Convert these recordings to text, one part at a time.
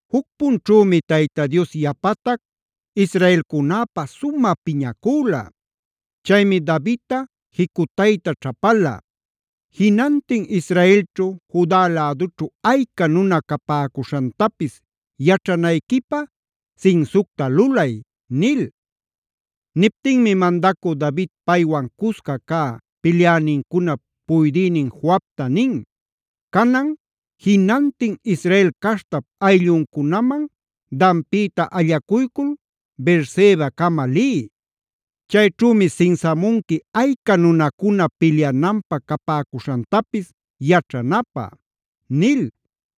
Juc punćhümi Tayta Dios yapatac israelcunäpä sumä piñacüla. Chaymi Davidta jicutayta ćhapala:a “Jinantin Israelćhu Juda lädućhu ayca nuna capäcuśhantapis yaćhanayquipä sinsucta lulay” nil. Niptinmi mandacü David paywan cusca cä pilyänincunap puydïnin Joabta nin: “Canan jinantin Israel caśhtap aylluncunaman Danpïta allacuycul Beersebacama liy. Chayćhümi sinsamunqui ayca nunacuna pilyananpä capäcuśhantapis yaćhanäpä” nil.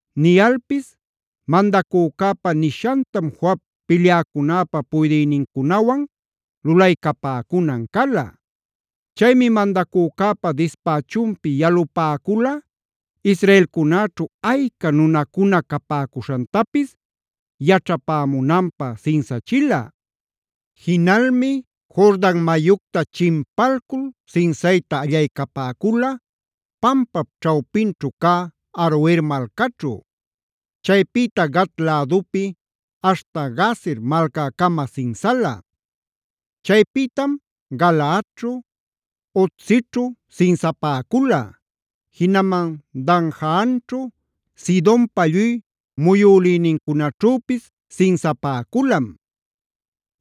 Niyalpis mandacücäpa nishantam Joab pilyäcunäpa puydïnincunawan lulaycapäcunan cala. Chaymi mandacücäpa dispächunpi yalupäcula israelcunäćhu ayca nunacuna capäcuśhantapis yaćhapämunanpä sinsachila. Jinalmi Jordan mayucta chimpalcul sinsayta allaycapäcula pampap ćhawpinćhu cä Aroer malcaćhu; chaypïta Gad lädupi aśhta Jazer malcäcama sinsala. Chaypïtam Galaadćhu, Hodsićhu sinsapäcula; jinaman Danjaanćhu, Sidonpa lluy muyulïnincunaćhüpis sinsapäculam.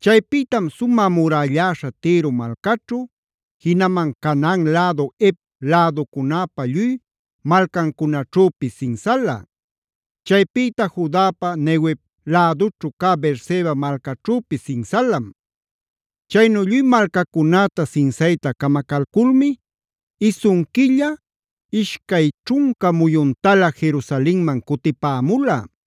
Chaypïtam sumä murälläśha Tiro malcaćhu, jinaman Canaan lädu Hev läducunäpa lluy malcancunaćhüpis sinsalam. Chaypïta Judapa Neguev lädućhu cä Beerseba malcaćhüpis sinsalam. Chaynu lluy malcacunäta sinsayta camacalculmi isun quilla, ishcay ćhunca muyuntalä Jerusalenman cutipämula.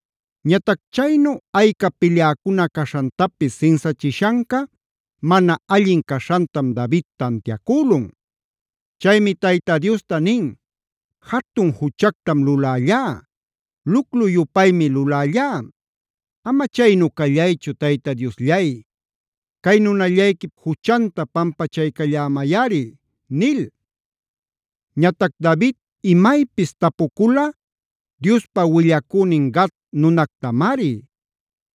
Ñatac chaynu ayca pilyäcuna caśhantapis sinsachishanca mana allin caśhantam David tantiacülun. Chaymi Tayta Diosta nin: “Jatun juchactam lulällá; luclu-yupaymi lulällá. Ama chaynu callaychu Tayta Diosllay, cay nunallayquip juchanta pampachaycallämayꞌari” nil. Ñatac David imaypis tapucula Diospa willacünin Gad nunactamari.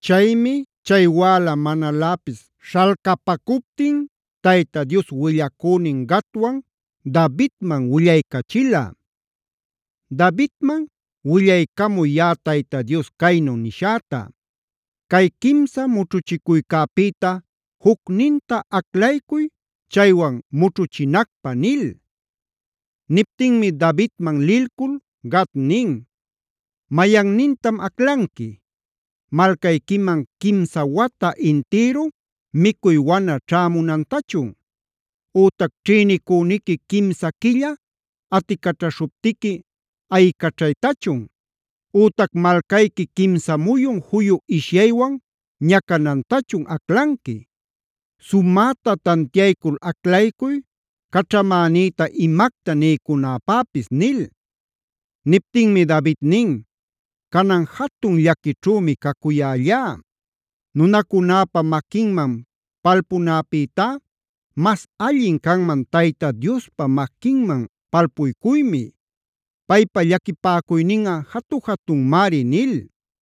Chaymi chay wäla manaläpis śhalcapacuptin Tayta Dios willacünin Gadwan Davidman willaycachila: “Davidman willaycamuy yaꞌa Tayta Dios caynu nishäta: ‘Cay quimsa mućhuchicuycäpïta jucninta aclaycuy chaywan mućhuchinacpä’” nil. Niptinmi Davidman lilcul Gad nin: “¿Mayannintam aclanqui? ¿Malcayquiman quimsa wata intïru micuy wana ćhämunantachun? Ütac ¿ćhïnicüniqui quimsa quilla aticaćhaśhuptiqui ayicaćhaytachun? Ütac ¿malcayqui quimsa muyun juyu ishyaywan ñacanantachun aclanqui? Sumäta tantiaycul aclaycuy caćhamänïta imacta niycunapäpis” nil. Niptinmi David nin: “Canan jatun llaquićhümi cacuyällá. Nunacunäpa maquinman palpunäpïtá mas allin canman Tayta Diospa maquinman palpuycuymi. Paypa llaquipäcuyninꞌa jatu-jatunmari” nil.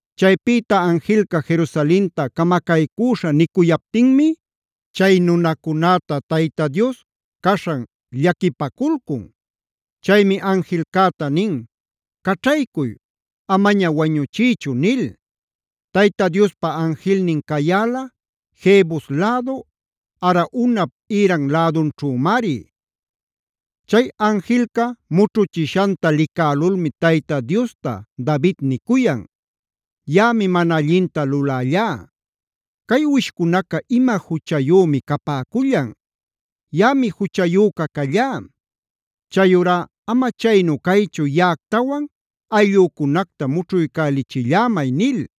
Chaypïta anjilca Jerusalenta camacaycüśha nicuyaptinmi chay nunacunäta Tayta Dios caśhan llaquipaculcun. Chaymi anjilcäta nin: “¡Caćhaycuy! Amaña wañuchiychu” nil. Tayta Diospa anjilnin cayäla Jebus lädu Araunap ïran lädunćhümari. Chay anjilca mućhuchishanta licälulmi Tayta Diosta David nicuyan: “Yaꞌami mana allinta lulällá. ¿Cay uwishcunaca ima juchayümi capäcullan? ¡Yaꞌami juchayüca callá! Chayurá ama chaynu caychu, yaꞌactawan ayllücunacta mućhuycachillämay” nil.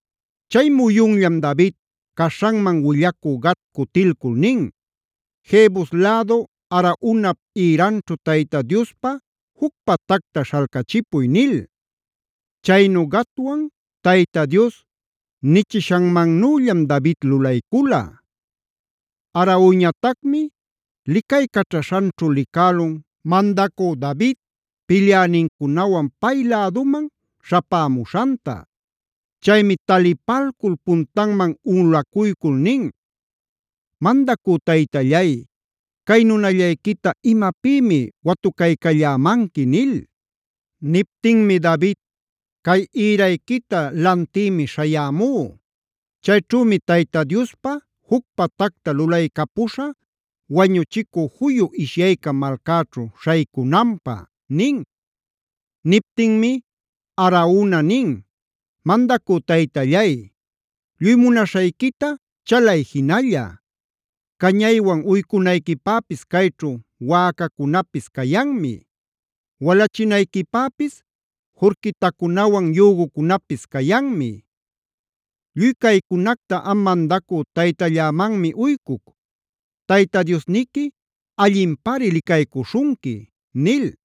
Chay muyunllam David caśhanman willacü Gad cutilcul nin: “Jebus lädu Araunap ïranćhu Tayta Diospa juc patacta śhalcachipuy” nil. Chaynu Gadwan Tayta Dios nichishanmannüllam David lulaycula. Araunañatacmi licaycaćhaśhanćhu licälun mandacü David pilyänincunawan pay läduman śhapämuśhanta. Chaymi talipalcul puntanman unꞌulacuycul nin: “Mandacü taytallay, ¿cay nunallayquita imapïmi watucaycallämanqui?” nil. Niptinmi David: “Cay ïrayquita lantïmi śhayämú. Chayćhümi Tayta Diospa juc patacta lulaycapuśhä wañuchicü juyu ishyayca malcäćhu śhaycunanpä” nin. Niptinmi Arauna nin: “Mandacü taytallay, lluy munaśhayquita chalay jinalla. Cañaywan uycunayquipäpis cayćhu wäcacunapis cayanmi. Walachinayquipäpis jurquitacunawan yügucunapis cayanmi. Lluy caycunacta am mandacü taytallämanmi uycuc. ¡Tayta Diosniqui allinpari licaycuśhunqui!” nil.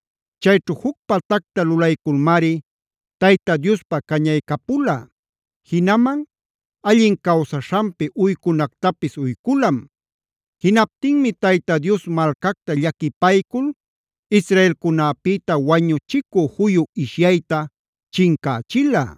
Chayćhu juc patacta lulayculmari Tayta Diospä cañaycapula, jinaman allin cawsaśhanpi uycunactapis uyculam. Jinaptinmi Tayta Dios malcacta llaquipaycul israelcunäpïta wañuchicu juyu ishyayta chincächila.